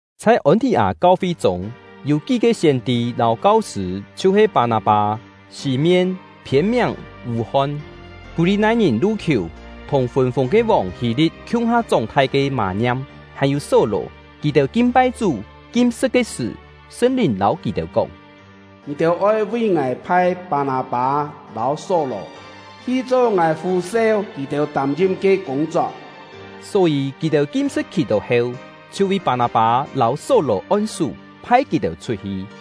Chhai Ôn-thì-â kau-fi chûng, yû kí-ke siên-tî lâu kau-sṳ̂, chhiu-he Pâ-nâ-pâ, Sî-mien (phiên-miàng “Vû-hon”), Kú-li-nai-ngìn Lu-khiù, thùng fûn-fûng ke vòng Hî-li̍t khiung-ha chóng-thai ke Mâ-ngiam, hàn-yû Só-lò. Kì-têu kin-pai Chú, kim-sṳ̍t ke sṳ̀, Sṳn-Lìn lâu kì-têu kóng: “Ngì-têu oi vi Ngài phai Pâ-nâ-pâ lâu Só-lò, hi cho Ngài fû-seu kì-têu tâm-ngim ke kûng-chok.” Só-yî, kì-têu kim-sṳ̍t khì-tó heu, chhiu vi Pâ-nâ-pâ lâu Só-lò on-sú, phai kì-têu chhut-hi.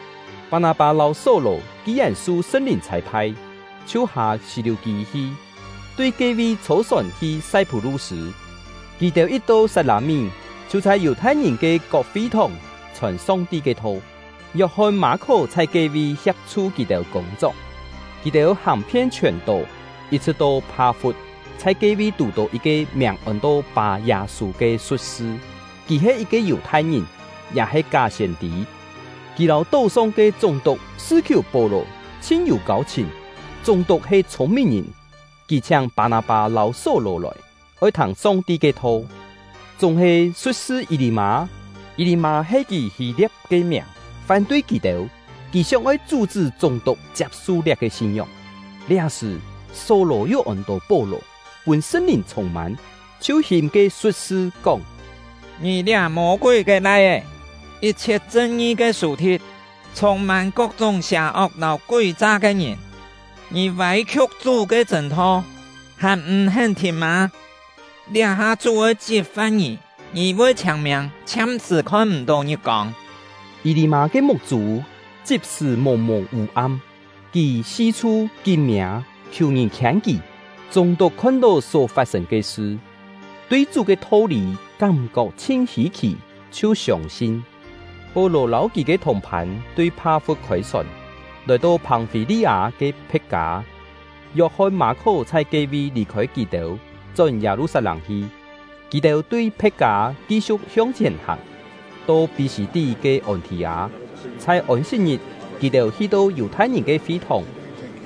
Pâ-nâ-pâ lâu Só-lò ki-yèn su Sṳn-Lìn chhâi-phai, chhiu hâ Sî-liù-kî hi, tui ke-vi chhô-sòn hi Sai-phú-lu-sṳ̂. Kì-têu yit-to Sat-lâ-mí, chhiu chhai Yù-thai-ngìn ke kok fi-thòng chhòn Song-ti ke tho. Yok-hon-Mâ-khó chhai ke-vi hia̍p-chhu kì-têu kûng-chok. Kì-têu hàng-phien chhiòn-tó, yit-chhṳ̍t to Pha-fut, chhai ke-vi tù-tó yit-ke miàng ôn-to Pâ-Yâ-sû ke su̍t-sṳ; kì he yit-ke Yù-thai-ngìn, ya he ká siên-tî. Kì lâu tó-song ke chúng-tuk Sṳ-khiù-Pó-lò chhin yû kâu-chhìn. Chúng-tuk he chhûng-mìn-ngìn; kì chhiáng Pâ-nâ-pâ lâu Só-lò lòi, oi thâng Song-ti ke tho. Chúng-he, su̍t-sṳ Yî-lî-mâ (Yî-lî-mâ he kì Hî-lia̍p ke miàng) fán-tui kì-têu; kì sióng-oi chú-chṳ́ chúng-tuk chiap-su liá-ke sin-ngióng. Liá-sṳ̀, Só-lò — yu ôn-to Pó-lò, pûn Sṳn-Lìn chhûng-mân, chhiu hìm ke su̍t-sṳ, kóng: “Ngì liá Mô-kúi ke lai-é, yit-chhiet chṳn-ngi ke sù-thi̍t, chhûng-mân kok-chúng sià-ok lâu kúi-cha ke ngìn! Ngì vâi-khiuk Chú ke chṳ̂n-tho, hàn m̀-hén thìn mâ! Liá-ha Chú oi chit-fa̍t ngì; ngì voi chhiâng-miâng, chhiam-sṳ̀ khon-m̀-tó ngit-kông.” Yî-lî-mâ ke muk-chû chit-sṳ̀ mùng-mùng vû-am; kì si-chhu kín miâ, khiù ngìn khiên kì. Chúng-tuk khon-tó só fat-sên ke sṳ, tui Chú ke tho-lî kám-kok chhin hî-khì, chhiu siông-sin. Pó-lò lâu kì ke thùng-phân tui Pha-fut khôi-sòn, lòi-to Phòng-fî-li-â ke Phe̍t-kâ; Yok-hon-Mâ-khó chhai ke-vi lì-khôi kì-têu, chón Yâ-lu-sat-lâng hi. Kì-têu tui Phe̍t-kâ ki-siu̍k hiong-chhièn hàng, to Pí-sî-tí ke Ôn-thì-â. Chhai Ôn-sit-ngit, kì-têu hi-to Yù-thai-ngìn ke fi-thòng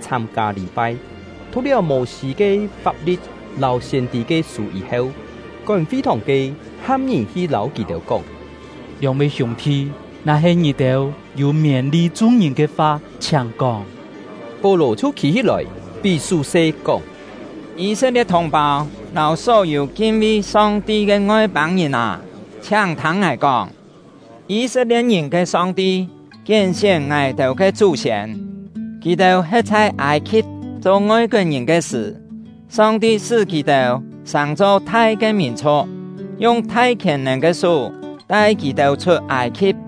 chhâm-kâ lî-pai. Thu̍k-liáu Mô-sî ke fap-li̍t lâu siên-tî ke sû yî-heu, kón fi-thòng ke ham ngìn hi lâu kì-têu kóng: “Lióng-vi hiûng-thi, na-he ngì-têu yû miên-li chung-ngìn ke fa, chhiáng kóng!” Pó-lò chhiu khî-hí-lòi, pí sú-se, kóng: “Yî-set-lie̍t thùng-pâu lâu só-yû kin-vi Song-ti ke Ngoi-pâng-ngìn â, chhiáng thâng ngài kóng! Yî-set-lie̍t-ngìn ke Song-ti kién-sién ngài-têu ke chú-siên. Kì-têu he̍t chhai Âi-khi̍p cho ngoi-koet-ngìn ke sṳ̀, Song-ti sṳ́ kì-têu sàng-cho thai ke mìn-chhu̍k, yung thai khièn-nèn ke sú tai kì-têu chhut Âi-khi̍p.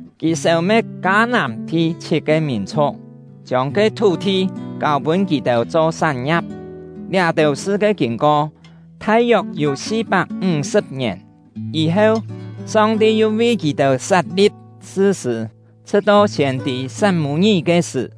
Kì sêu-me̍t Kâ-nàm-thi chhit-ke mìn-chhu̍k, chiông ke thú-thi kâu-pûn kì-têu cho sán-ngia̍p. Liá-têu sṳ ke kîn-ko thai-yok yû si-pak ńg-sṳ̍p ngièn. “Yî-heu, Song-ti yu vi kì-têu sat-li̍p sṳ-sṳ̂, chhṳ̍t-to siên-tî Sat-mû-ngí ke sṳ̀.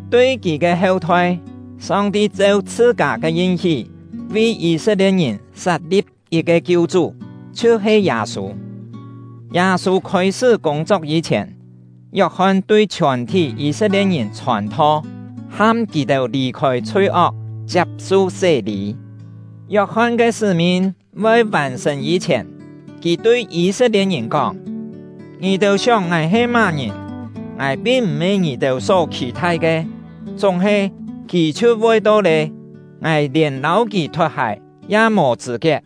Tui kì ke heu-thoi, Song-ti cheu chhṳ-kâ ke yin-hí vi Yî-set-lie̍t-ngìn sat-li̍p yit-ke Kiu-chú, chhiu-he Yâ-sû. Yâ-sû khôi-sṳ́ kûng-chok yî-chhièn, Yok-hon tui chhiòn-thí Yî-set-lie̍t-ngìn chhòn-tho, ham kì-têu lì-khôi chhui-ok, chiap-su sé-lî. Yok-hon ke sṳ́-min voi vàn-sṳ̀n yî-chhièn, kì tui Yî-set-lie̍t-ngìn kóng: ‘Ngì-têu sióng ngài he má-ngìn? Ngài pin m̀-he ngì-têu só khì-thai ke; chúng-he, kì chhiu voi to lé, ngài lièn lâu kì thot-hài ya mò chṳ̂-kiet.’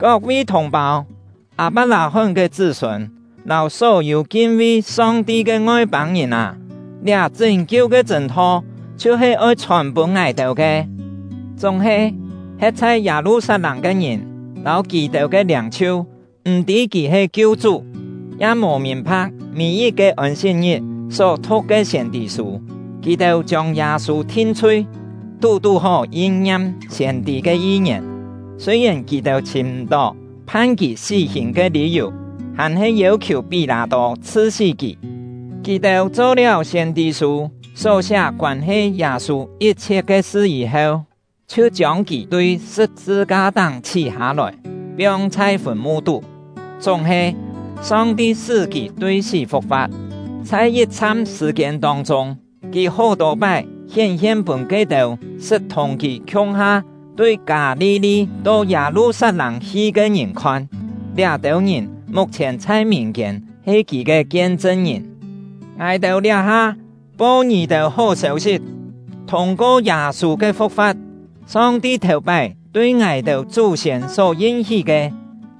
“Kok-vi thùng-pâu — Â-pak-lâ-hón ke chṳ́-sûn, lâu só-yû kin-vi Song-ti ke Ngoi-pâng-ngìn â! Liá chṳ́n-kiu ke chṳ̂n-tho chhiu-he oi chhòn-pûn ngài-têu ke! Chúng-he, he̍t chhai Yâ-lu-sat-lâng ke ngìn lâu kì-têu ke liâng-chhiu m̀-tî kì he Kiu-chú, ya mò mìn-pha̍k mî-yit-ke Ôn-sit-ngit só thu̍k ke siên-tî-sû. Kì-têu chiông Yâ-sû thin-chhui, tú-tú-hó yin-ngiam siên-tî ke yi-ngièn. Sûi-yèn kì-têu chhìm m̀-tó phan kì sí-hìn ke lî-yù, hàn-he yêu-khiù Pí-lâ-tô chhṳ-sí kì. Kì-têu cho-liáu siên-tî-sû só siá koân-he Yâ-sû yit-chhiet ke sṳ yî-heu, chhiu chiông kì tui sṳ̍p-sṳ-ka-táng chhí-hâ-lòi, piong chhai fùn-mu-tú. Chúng-he, Song-ti sṳ́ kì tui sí fu̍k-fa̍t; chhai yit-chham sṳ̀-kiên tông-chûng, kì hó-tô pái hién-hien pûn ke-têu sṳt thùng kì khiung-ha tui Kâ-li-li to Yâ-lu-sat-lâng hi ke ngìn khon. Liá-têu ngìn muk-chhièn chhai mìn-kiên he kì ke kien-chṳn-ngìn. Ngài-têu liá-ha po ngì-têu hó sêu-sit: Thûng-ko Yâ-sû ke fu̍k-fa̍t, Song-ti thèu-pái tui ngài-têu ke chú-siên só yin-hí ke,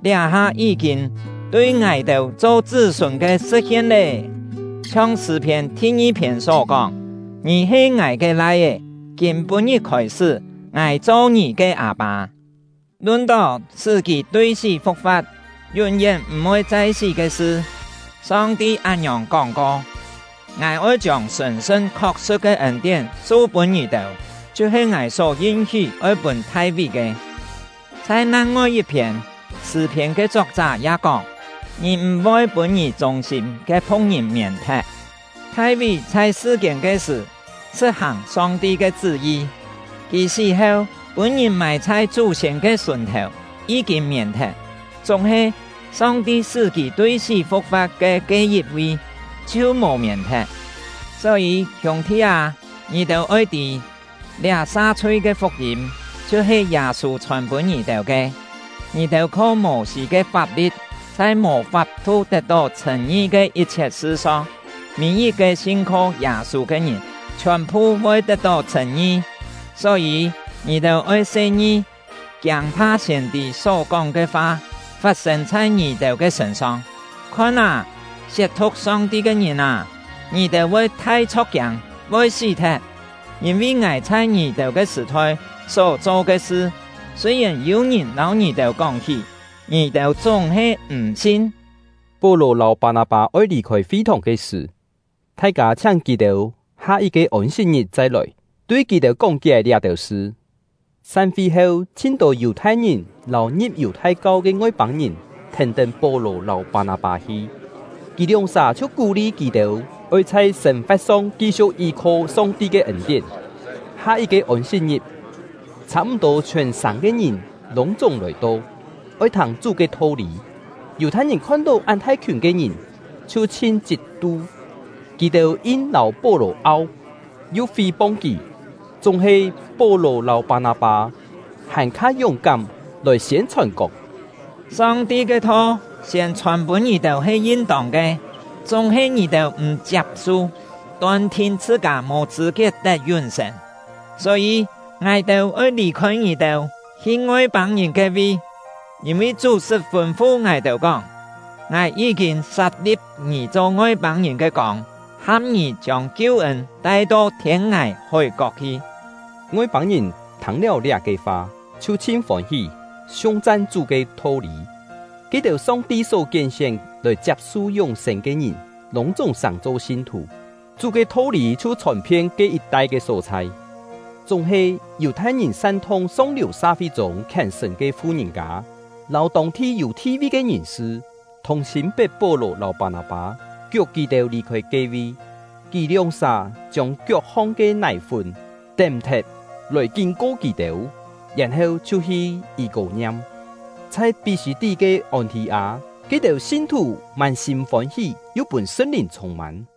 liá-ha yí-kîn tui ngài-têu cho chṳ́-sûn ke sṳ̍t-hien lé. Chhiong Sṳ̂-phiên thi-ngi-phiên só kóng: Ngì he Ngài ke Lai-é; kîm-pû-ngit khôi-sṳ́, Ngài cho ngì ke Â-pâ. Lun-tó sṳ́ kì tui sí fu̍k-fa̍t, yún-yén m̀-voi chai sí ke sṳ, Song-ti án-ngiòng kóng-ko: Ngài oi chiông sṳ̀n-sṳn khok-sṳ̍t ke ên-tién su-pûn ngì-têu, chhiu-he Ngài só yin-hí oi pûn Thai-ví ke. Chhai nang-ngoi yit-phiên, Sṳ̂-phiên ke chok-chá ya kóng: Ngì m̀-voi pûn Ngì chûng-sîm ke phu̍k-ngìn mièn-thet. Thai-ví chhai sṳ-kiên ke sṳ̀, sṳ̍t-hàng Song-ti ke chṳ́-yi; kì sí heu, pûn-ngìn mài chhai chú-siên ke sùn-thèu, yí-kîn mièn-thet. Chúng-he, Song-ti sṳ́ kì tui sí fu̍k-fa̍t ke ke yit-vi, chhiu mò mièn-thet. Só-yî hiûng-thi â, ngì-têu oi tî: Liá sa-chhui ke fuk-yîm chhiu-he Yâ-sû chhòn pûn ngì-têu ke. Ngì-têu kho Mô-sî ke fap-li̍t chhai mò fap-thu tet-tó chhṳ̂n-ngi ke yit-chhiet sṳ-song, mî-yit-ke sin-kho Yâ-sû ke ngìn chhiòn-phu voi tet-tó chhṳ̂n-ngi. Só-yî, ngì-têu oi se-ngi, kiâng-pha siên-tî só-kóng ke fa fat-sên chhai ngì-têu ke sṳ̂n-song: Khon â, siet-thu̍k Song-ti ke ngìn â, ngì-têu voi thai chho̍k-kiâng, voi sí-thet! Yîn-vi Ngài chhai ngì-têu ke sṳ̀-thoi só cho ke sṳ, sûi-yèn yû-ngìn lâu ngì-têu kóng-hí, ngì-têu chúng-he m̀ sin!” Pó-lò lâu Pâ-nâ-pâ oi lì-khôi fi-thòng ke sṳ̀, thai-kâ chhiáng kì-têu ha yit-ke Ôn-sit-ngit chai lòi, tui kì-têu kóng-kié liá-têu sṳ. San-fi heu, chhin-tô Yù-thai-ngìn lâu ngi̍p Yù-thai-kau ke Ngoi-pâng-ngìn thèn-tén Pó-lò lâu Pâ-nâ-pâ hi. Kì lióng-sà chhiu kú-li kì-têu oi chhai sên-fa̍t-song ki-siu̍k yí-kho Song-ti ke ên-tién. Ha yit-ke Ôn-sit-ngit, chhâ-m̀-tô chhiòn-sàng ke ngìn lûng-chúng lòi-to, oi thâng Chú ke tho-lî. Yù-thai-ngìn khon-tó án thai-khiùn ke ngìn, chhiu chhin chhit-tu; kì-têu ngang lâu Pó-lò au, yu fí-pong kì. Chúng-he, Pó-lò lâu Pâ-nâ-pâ hàn-kha yúng-kám lòi siên-chhòn kóng: “Song-ti ke tho siên chhòn-pûn ngì-têu he yin-tông ke; chúng-he ngì-têu m̀ chiap-su, ton-thin chhṳ-kâ mò chṳ̂-kiet tet yún-sên. Só-yî, ngài-têu oi lì-khôi ngì-têu, hi Ngoi-pâng-ngìn ke-vi; yîn-vi Chú sṳt fûn-fu ngài-têu kóng: Ngài yí-kîn sat-li̍p ngì cho Ngoi-pâng-ngìn ke kông, ham ngì chiông kiu-ên tai-to thiên-ngài hói-kok hi.” Ngoi-pâng-ngìn thâng-liáu liá-ke fa, chhiu chhin fôn-hí, siung-chan Chú ke tho-lî; ke-têu Song-ti só kién-sién lòi chiap-su yún-sên ke ngìn, lûng-chúng sàng-cho sin-thù. Chú ke tho-lî chhiu chhòn-phien ke yit-tai ke só-chhai. Chúng-he, Yù-thai-ngìn san-thung song-liù sa-fi-chûng khièn-sṳ̀n ke fu-ngìn-kâ, lâu tông-thi yû thi-vi ke ngìn-sṳ, thùng-sîm pet Pó-lò lâu Pâ-nâ-pâ, kiuk kì-têu lì-khôi ke-vi. Kì lióng-sà chiông kiok-hong ke nài-fún tém-thet lòi kín-ko kì-têu, yèn-heu chhiu hi Yî-kô-ngiam. Chhai Pí-sî-tí ke Ôn-thì-â, ke-têu sin-thù mân-sîm fôn-hí, yu pûn Sṳn-Lìn chhûng-mân.